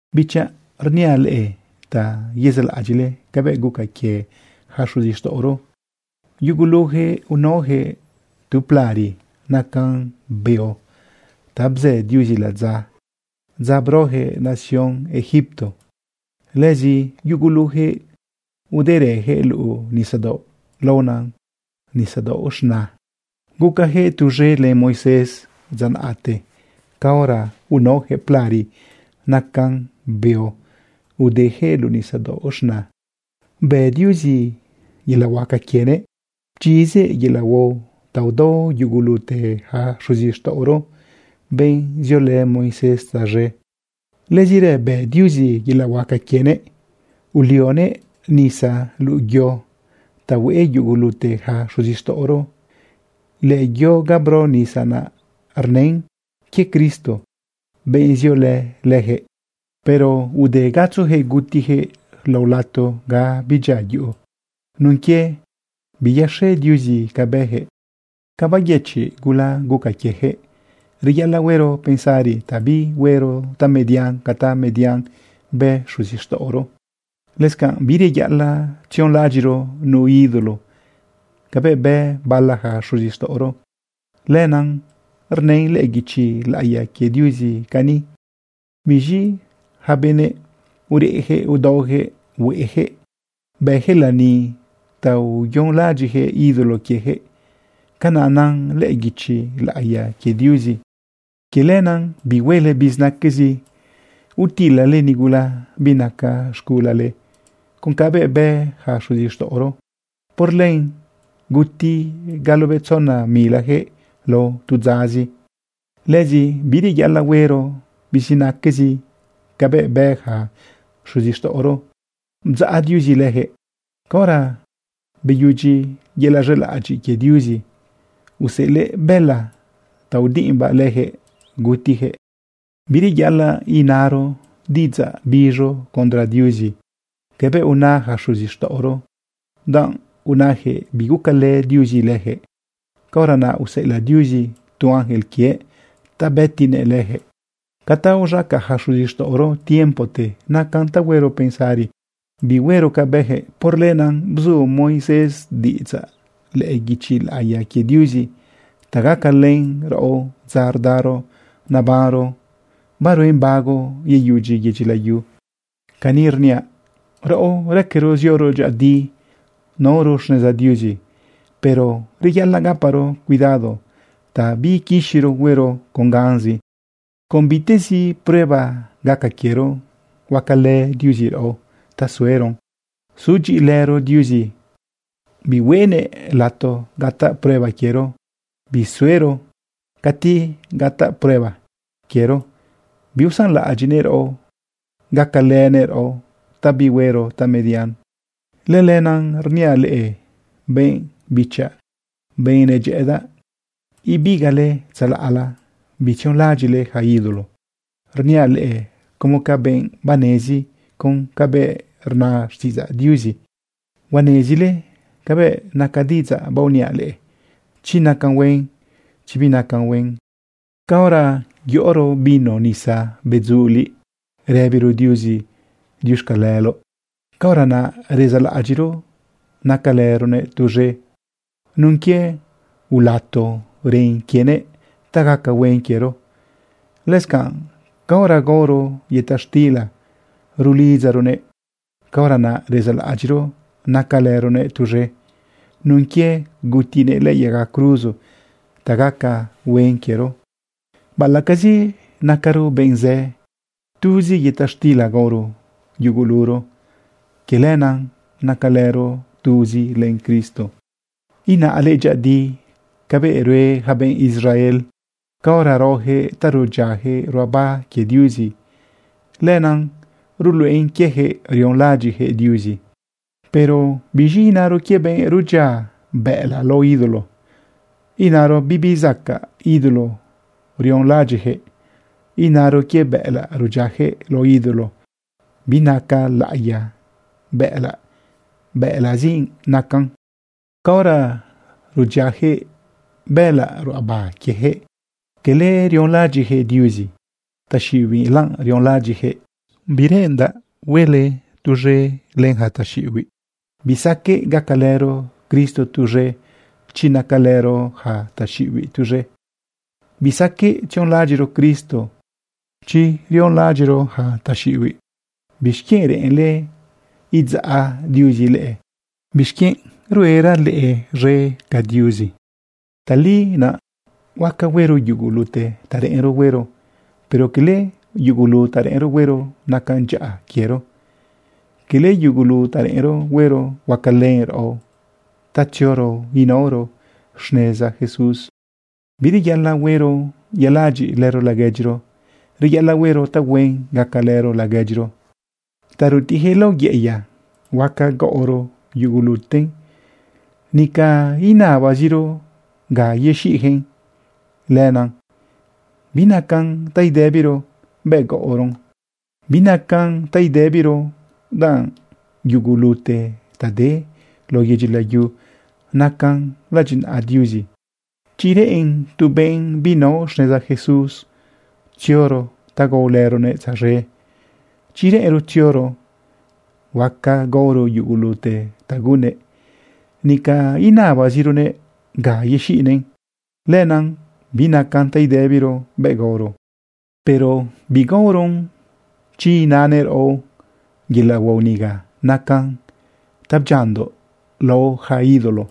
Bichaꞌ, rniaꞌ leꞌe ta yezaꞌlaꞌadyiꞌle cabëꞌ guca quie yaca xuzixtaꞌoro. Yuguluyaquëꞌ unaoyaquëꞌ tu plari nacan beo ta bzë Diuzi ladza dza broyaquëꞌ nación Egipto. Lëzi yuguluyaquëꞌ uderëyaquëꞌ luꞌu nisadaoꞌ laona Nisadaoꞌ Z̃na. Gucayaquëꞌ tuz̃e len Moisés dza naꞌte caora unaoyaquëꞌ plari nacan beo udeyaquëꞌ luꞌu Nisadaoꞌ Z̃na. Bë Diuzi yelaꞌ huaca quienëꞌ pchizëꞌ yelaꞌ huao ta udao yugulute yaca xuzixtaꞌoro, benꞌ ziolë Moisés tzaz̃e. Lëzirë bë Diuzi yelaꞌ huaca quienëꞌ ulioguëꞌ nisa luꞌu yo ta hueꞌe yugulute yaca xuzixtaꞌoro. Lëyo ga bro nisa rnën quie Cristo, benꞌ ziolë leyaquëꞌ. Pero ude gatzoyaquëꞌ gutiyaquëꞌ lao lato ga bidyia yuꞌu nun quie biyaxe Diuzi ca bëyaquëꞌ. Ca beyëchiꞌ gula guca quieyaquëꞌ, reyaꞌalaꞌ huero pensari ta bihuero tamedian ca tamedian bë xuzixtaꞌoro. Lëscanꞌ bireyaꞌalaꞌ tzionlaꞌadyiꞌro nu ídolo cabëꞌ bë bala yaca xuzixtaꞌoro. Lenaꞌ rnën lëꞌë guichi laꞌiya quie Diuzi cani: “Biz̃i yaca benëꞌ ureꞌyaquëꞌ udaoyaquëꞌ hueꞌeyaquëꞌ. Bëyaquëꞌ lani ta uyonlaꞌadyiꞌyaquëꞌ ídolo quieyaquëꞌ.” Canaꞌ nan lëꞌë guichi laꞌiya quie Diuzi. Quie lenaꞌ bihuele bizinaquezi utilale nigula binaca z̃gulale con cabëꞌ bë yaca xuzixtaꞌoro. Por len guti galobetzona milayaquëꞌ lao tu dzazi. Lëzi bireyaꞌalaꞌ huero bizinaquezi cabëꞌ bë yaca xuzixtaꞌoro bdzaꞌ Diuzi leyaquëꞌ. Caora beyudyi yelaꞌ z̃elaꞌadyiꞌ quie Diuzi, useꞌelëꞌ bëla ta udiꞌimbaꞌ leyaquëꞌ gutiteyaquëꞌ. Bireyaꞌalaꞌ inaro diꞌidzaꞌ biz̃u condre Diuzi cabëꞌ una yaca xuzixtaꞌoro danꞌ unajëꞌ bigucalë Diuzi leyaquëꞌ. Caora naꞌ useꞌelaꞌ Diuzi tu ángel quiëꞌ ta bëtinëꞌ leyaquëꞌ. Ca ta uz̃aca yaca xuzixtaꞌoro tiempote nacan ta huero pensari bihuero ca bëyaquëꞌ. Por lenaꞌ bzu Moisés diꞌidzaꞌ lëꞌë guichi laꞌiya quie Diuzi ta gacalën raꞌo dza rdaro nebanro baruen bago yeyudyi yedyi layu. Cani rniaꞌ, raꞌo raquero zioro dyëꞌëdi inaoro xneza Diuzi, pero reyaꞌalaꞌ gaparo cuidado ta biiquixiro huero con ganzi. Con bitezi prueba gaca quiero, huacalë Diuzi raꞌo ta sueron. Sudyiꞌilëro Diuzi bihuenëꞌ lato gataꞌ prueba quiero bisuero. Cati gataꞌ prueba quiero, biusanlaꞌadyiꞌnëꞌ raꞌo, gacalënëꞌ raꞌo ta bihuero tamedian. Lëlenaꞌ rniaꞌ leꞌe benꞌ bichaꞌ, benꞌ nedyëꞌëdaꞌ. Ibigaꞌle tzalaꞌla, bitzionlaꞌadyiꞌle yaca ídolo. Rniaꞌ leꞌe como ca benꞌ banezi con cabëꞌ rna xtiꞌidzaꞌ Diuzi. Huanezile cabëꞌ naca diꞌidzaꞌ baoniaꞌ leꞌe, chi nacan huen, chi binacan huen. Caora yoꞌoro vino nisa bedzuliꞌ rëbiro Diuzi diuxcaleloꞌ, caora naꞌ rezaꞌlaꞌadyiꞌro nacalëronëꞌ tuz̃e nun quie ulato ren quienëꞌ ta gaca huen quiero. Lëscanꞌ caora gaoro yëta xtila rulidzaronëꞌ, caora naꞌ rezaꞌlaꞌadyiꞌro nacalëronëꞌ tuz̃e nun quie gutinëꞌ lëꞌë yaga cruzo ta gaca huen quiero. Baꞌalaꞌcazi nacaro benꞌ zë, tuzi yëta xtila gaoro yuguluro. Quie lenaꞌ nacalëro tuzi len Cristo. Inaꞌle dyëꞌëdi cabëꞌ rue yaca benꞌ Israel. Caora raoyaquëꞌ ta rudyiayaquëꞌ ruꞌaba quie Diuzi, lenaꞌ rluꞌen quieyaquëꞌ rionlaꞌadyiꞌyaquëꞌ Diuzi. Pero ¿biz̃i inaro quie benꞌ rudyia bëꞌëlaꞌ lao ídolo? Inaro bibi zacaꞌ ídolo rionlaꞌadyiꞌyaquëꞌ. Inaro quie bëꞌëlaꞌ rudyiayaquëꞌ lao ídolo binaca laꞌiya bëꞌëlaꞌ, bëꞌëlaꞌzi nacan. Caora rudyiayaquëꞌ bëꞌëlaꞌ ruꞌaba quieyaquëꞌ, cala rionlaꞌadyiꞌyaquëꞌ Diuzi, taxiꞌibiꞌla rionlaꞌadyiꞌyaquëꞌ. Bireꞌendaꞌ huele tuz̃e len yaca taxiꞌibiꞌ. Bisaqueꞌ gacalëro Cristo tuz̃e chi nacalëro yaca taxiꞌibiꞌ tuz̃e. Bisaqueꞌ tzionlaꞌadyiꞌro Cristo chi rionlaꞌadyiꞌro yaca taxiꞌibiꞌ. ¿Bixquienꞌ reꞌenle idzaꞌ Diuzi leꞌe? ¿Bixquienꞌ ruera leꞌe z̃e ca Diuzi? Tali naꞌ huaca huero yugulute ta reꞌenro huero, pero cala yugulu ta reꞌenro huero nacan dyaꞌa quiero, cala yugulu ta reꞌenro huero huacalën raꞌo ta tzioro inaoro xneza Jesús. Bireyaꞌalaꞌ huero yaladyiꞌ lëro laguedyiro. Reyaꞌalaꞌ huero tahuen gacalëro laguedyiro. Ta rutiꞌyaquëꞌ lao yeꞌeya, huaca gaoro yuguluten. Nica inabaziro ga yexiꞌyaquëꞌn. Lenaꞌ binacan ta idëbiro bëꞌ gaoron. Binacan ta idëbiro, danꞌ yugulute ta de lao yedyi layu nacan ladyinaꞌa Diuzi. Chi reꞌen tu benꞌ binao xneza Jesús tzioro ta gaolëronëꞌ tzaz̃e, chi reꞌenro tzioro, huaca gaoro yugulute ta gunnëꞌ. Nica inabazironëꞌ ga yexiꞌnëꞌn. Lenaꞌ binacan ta idëbiro bëꞌ gaoron. Pero bigaoron chi inanëꞌ raꞌo: “Yelaꞌ huao niga nacan ta bdyiandoꞌ lao yaca ídolo.”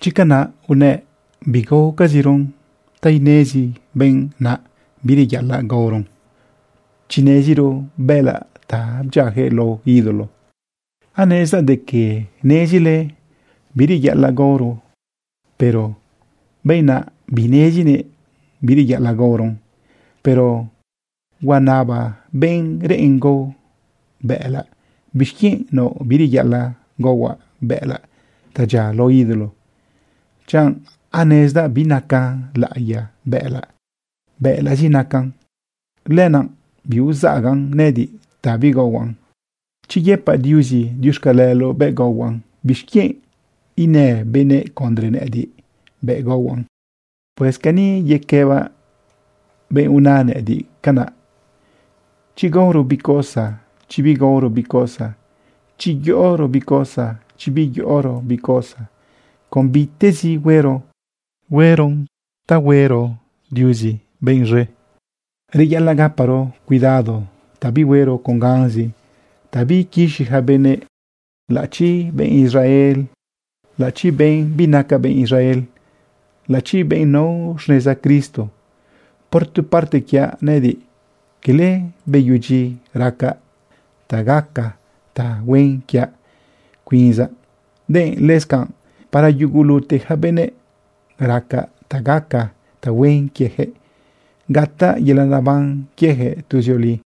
Chi canaꞌ unëꞌ, bigaocaziron ta inezi benꞌ naꞌ bireyaꞌalaꞌ gaoron chi neziro bëꞌëlaꞌ ta bdyiayaquëꞌ lao ídolo. Anezdaꞌ de que nezile bireyaꞌalaꞌ gaoron, pero benꞌ naꞌ binezinëꞌ bireyaꞌalaꞌ gaoron. Pero huanaba benꞌ reꞌen gao bëꞌëlaꞌ: “¿Bixquienꞌ naoꞌ bireyaꞌalaꞌ gaohuaꞌ bëꞌëlaꞌ ta dyia lao ídolo, chanꞌ anezdaꞌ binaca laꞌiya bëꞌëlaꞌ, bëꞌëlaꞌzi nacan? Lenaꞌ biuzagan nëꞌëdiꞌ ta bigaohuaꞌn. Chi yëpaꞌ Diuzi diuxcaleloꞌ bëꞌ gaohuaꞌn, ¿bixquienꞌ inë benëꞌ condre nëꞌëdiꞌ bëꞌ gaohuaꞌn?” Pues cani yequëbaꞌ benꞌ una nëꞌëdiꞌ canaꞌ: Chi gaoro bi cosa, chi bigaoro bi cosa, chi yoꞌoro bi cosa, chi biyoꞌoro bi cosa, con bitezi huero, hueron ta huero Diuzi benꞌ z̃e. Reyaꞌalaꞌ gaparo cuidado ta bihuero con ganzi ta biiquixi yaca benëꞌ, laꞌachi benꞌ Israel, laꞌachi benꞌ binaca benꞌ Israel, laꞌachi benꞌ nao xneza Cristo. Por tu parte quiaꞌ nëꞌëdiꞌ, quele beyudyi racaꞌ ta gaca tahuen quiaꞌ cuinzaꞌ, denꞌ lëscanꞌ para yugulute yaca benëꞌ, racaꞌ ta gaca tahuen quieyaquëꞌ gataꞌ yelaꞌ neban quieyaquëꞌ tuzioli.